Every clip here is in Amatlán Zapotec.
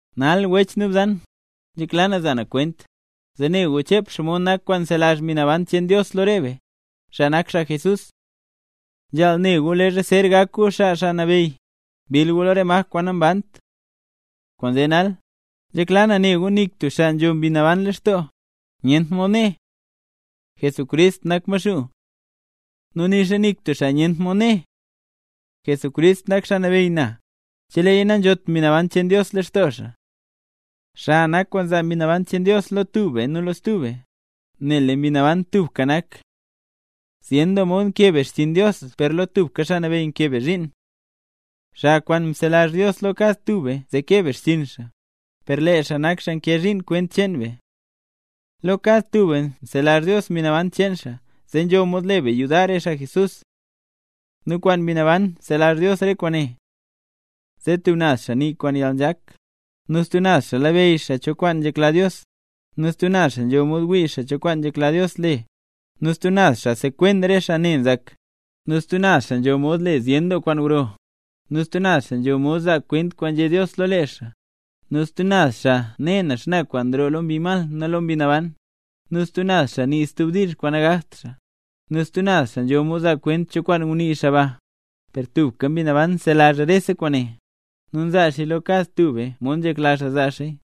Nal wech nu bzan, nzhekla na za na kwent, zee ne gu chep xomod nak kwaan nzelazh Mbi Naban cheen Dios lo re be, xaa nak xaa Jesús. Nzhaal ne gu leezha zer gak gu xaa Xaa Nabeyy, mbill gu lo re maj kwaan nambant. Kwaanzee nal, nzhekla na ne gu nik tub xaa kwaan nzho Mbi Naban lextoo, nyent mod né: “Jesucrist nak Maxuu”. Nu nixa nik tub xaa nyent mod né: “Jesucrist nak Xaa Nabeyy na”, cheleeya nanzhot Mbi Naban cheen Dios lextoo xaa. Xa nak kwaan nzaa Mbi Naban cheen Dios lo tub be nu lo stub be, nel lee Mbi Naban tubka nak. Zyen doo mod nkee be xchiin Dios per lo tubka Xaa Nabeyy nkee be zhiin. Xa kwaan nzelazh Dios lo kad tub be zee kee be xchiin xaa, per lee xaa nak xaa nkee zhiin kwent cheen be. Lo kad tub be nzelazh Dios Mbi Naban cheen xaa, zee nzho mod le be yudar re xaa Jesús. Nu kwaan Mbi Naban nzelazh Dios re kwaane: zee tub naz xaa nii kwaan yalnzhak, nu stub naz xaa labeyy cho kwaan nzhekla Dios, nu stub naz xaa nzho mod wii cho kwaan nzhekla Dios le, nu stub naz xaa sekwen re xaa ne nzak, nu stub naz xaa nzho mod le zyen doo kwaan gro, nu stub naz xaa nzho mod zaa kwent kwaan nzhé Dios lo lee xaa, nu stub naz xaa ne xana kwaan nroo lo mbi mal nu lo Mbi Naban, nu stub naz xaa nii stub diizh kwaan nagakt xaa, nu stub naz xaa nzho mod zaa kwent cho kwaan ngunii xaa ba, Per tubka Mbi Naban nzelazh rese kwaane, nu nzaa xaaya lo kad tub be mod nzhekla xaa zaa xaaya.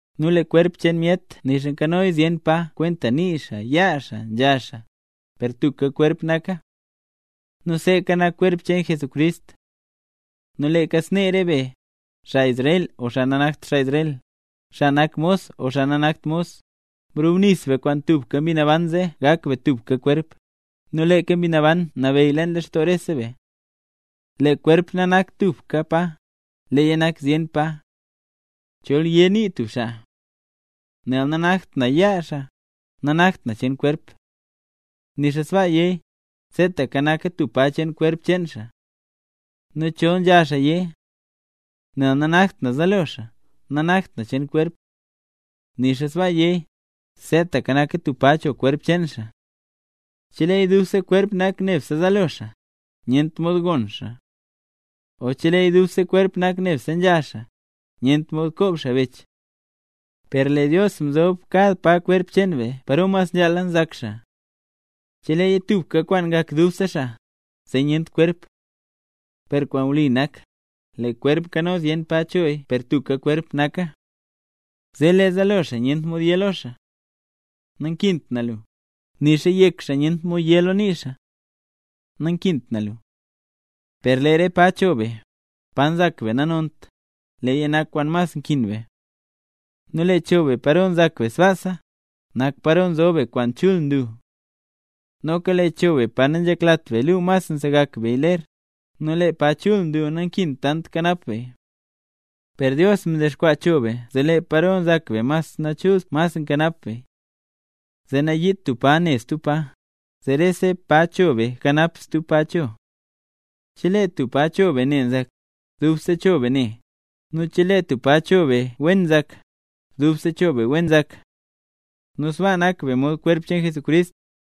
Nu lee kwerp cheen myet nixa nkanoya zyen pa (kwenta nii xaa, yaa xaa, nzha xaa), per tubka kwerp naka. Nu seeka nak kwerp cheen Jesucrist. Nu leeka snee rese be, xaa Israel o xaa nanakt xaa Israel, xaa nak mos o xaa nanakt mos, mrubnis be kwaan tubka Mbi Naban zee gak be tubka kwerp, nu leeka Mbi Naban nabeyy leen lextoo rese be. Lee kwerp nanakta tubka pa, leeya nak zyen pa. Chol yé nii tub xaa: “Nel nanakt na yaa xaa, nanakt na cheen kwerp”. Nixa sbaa yéya, seetaka naka tub pa cheen kwerp cheen xaa. Nu chol nzha xaa yé: “Nel nanakt na zaalo xaa, nanakta na cheen kwerp”. Nixa sbaa yéya, seetaka naka tub pa cho kwerp cheen xaa. Chelee dubse kwerp nak nebse zaalo xaa, nyent mod gon xaa. O chelee dubse kwerp nak nebse nzha xaa, nyent mod koob xaa bech. Per lee Dios mzob kad pa kwerp cheen be paro mas wen nzhaala nzak xaa. Cheleeya tubka kwaan ngak dubse xaa, zee nyent kwerp. Per kwaan wli nak, lee kwerp nkano zyen pa choya per tubka kwerp naka. Zee lee zaalo xaa nyent mod yé lo yaa xaa: “Nankint na lu”; nixa yek xaa nyent mod yé lo nii xaa: “Nankint na lu”. Per lee re pa cho be, pa nzak be nanont, leeya nak kwaan mas nkin be. Nu lee cho be paro nzak be sbaasa, nak paro nzob be kwaan chul nlu. Noka lee cho be pa nanzheklat be luu mas nsegak beya ler, nu lee pa mas chul nlu nankint tant kanap beya. Per Dios mdexkwaa cho be zee lee paro nzak be mas nachult mas nkanap beya. Zee nayiit tub pa ne stub pa, zee rese pa cho be kanap stub pa cho. Chelee tub pa cho be ne nzak, dubse cho be ne; nu chelee tub pa cho be wen nzak, dubse cho be wen nzak. Nu sbaa nak be mod kwerp cheen Jesucrist,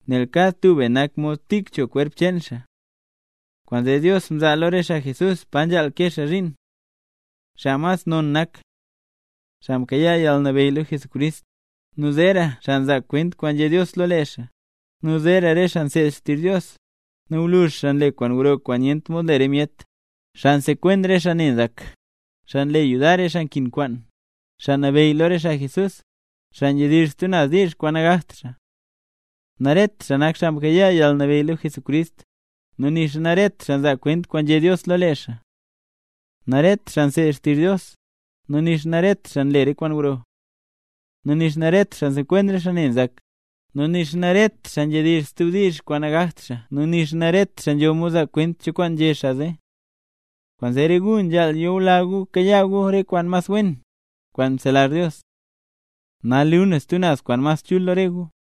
nel kad tub be nak mod tik cho kwerp cheen xaa. Kwaanzee Dios mzaa lo re xaa Jesús pa nzhaal kee xaa zhiin. Xaa mas non nak xaa mkayaa yalnabeyy lo Jesucrist, nu zeera xaa nzaa kwent kwaan nzhé Dios lo lee xaa, nu zeera re xaa nseed xtizh Dios, nu gwluzh xaa nle kwaan gro kwaan nyent mod le re myet, xaa nsekwen re xaa ne nzak, xaa nle yudar re xaa nkin kwaan, xaa nabeyy lo re xaa Jesús, xaa nzhedizh stub naz diizh kwaan nagakt xaa. Naret xaa nak xaa mkayaa yalnabeyy lo Jesucrist, nu nixa naret xaa nzaa kwent kwaan nzhé Dios lo lee xaa. Naret xaa nseed xtizh Dios, nu nixa naret xaa nle re kwaan gro. Nu nixa naret xaa nsekwen re xaa ne nzak, nu nixa naret xaa nzhedizh stub diizh kwaan nagakt xaa nu nixa naret xaa nzho mod nzaa kwent cho kwaan nzhé xaa zee. Kwaanzee re gu nzhaal yula gu kayaa gu re kwaan mas wen, kwaan nzelazh Dios. Nal luu na stub naz kwaan mas chul lo re gu.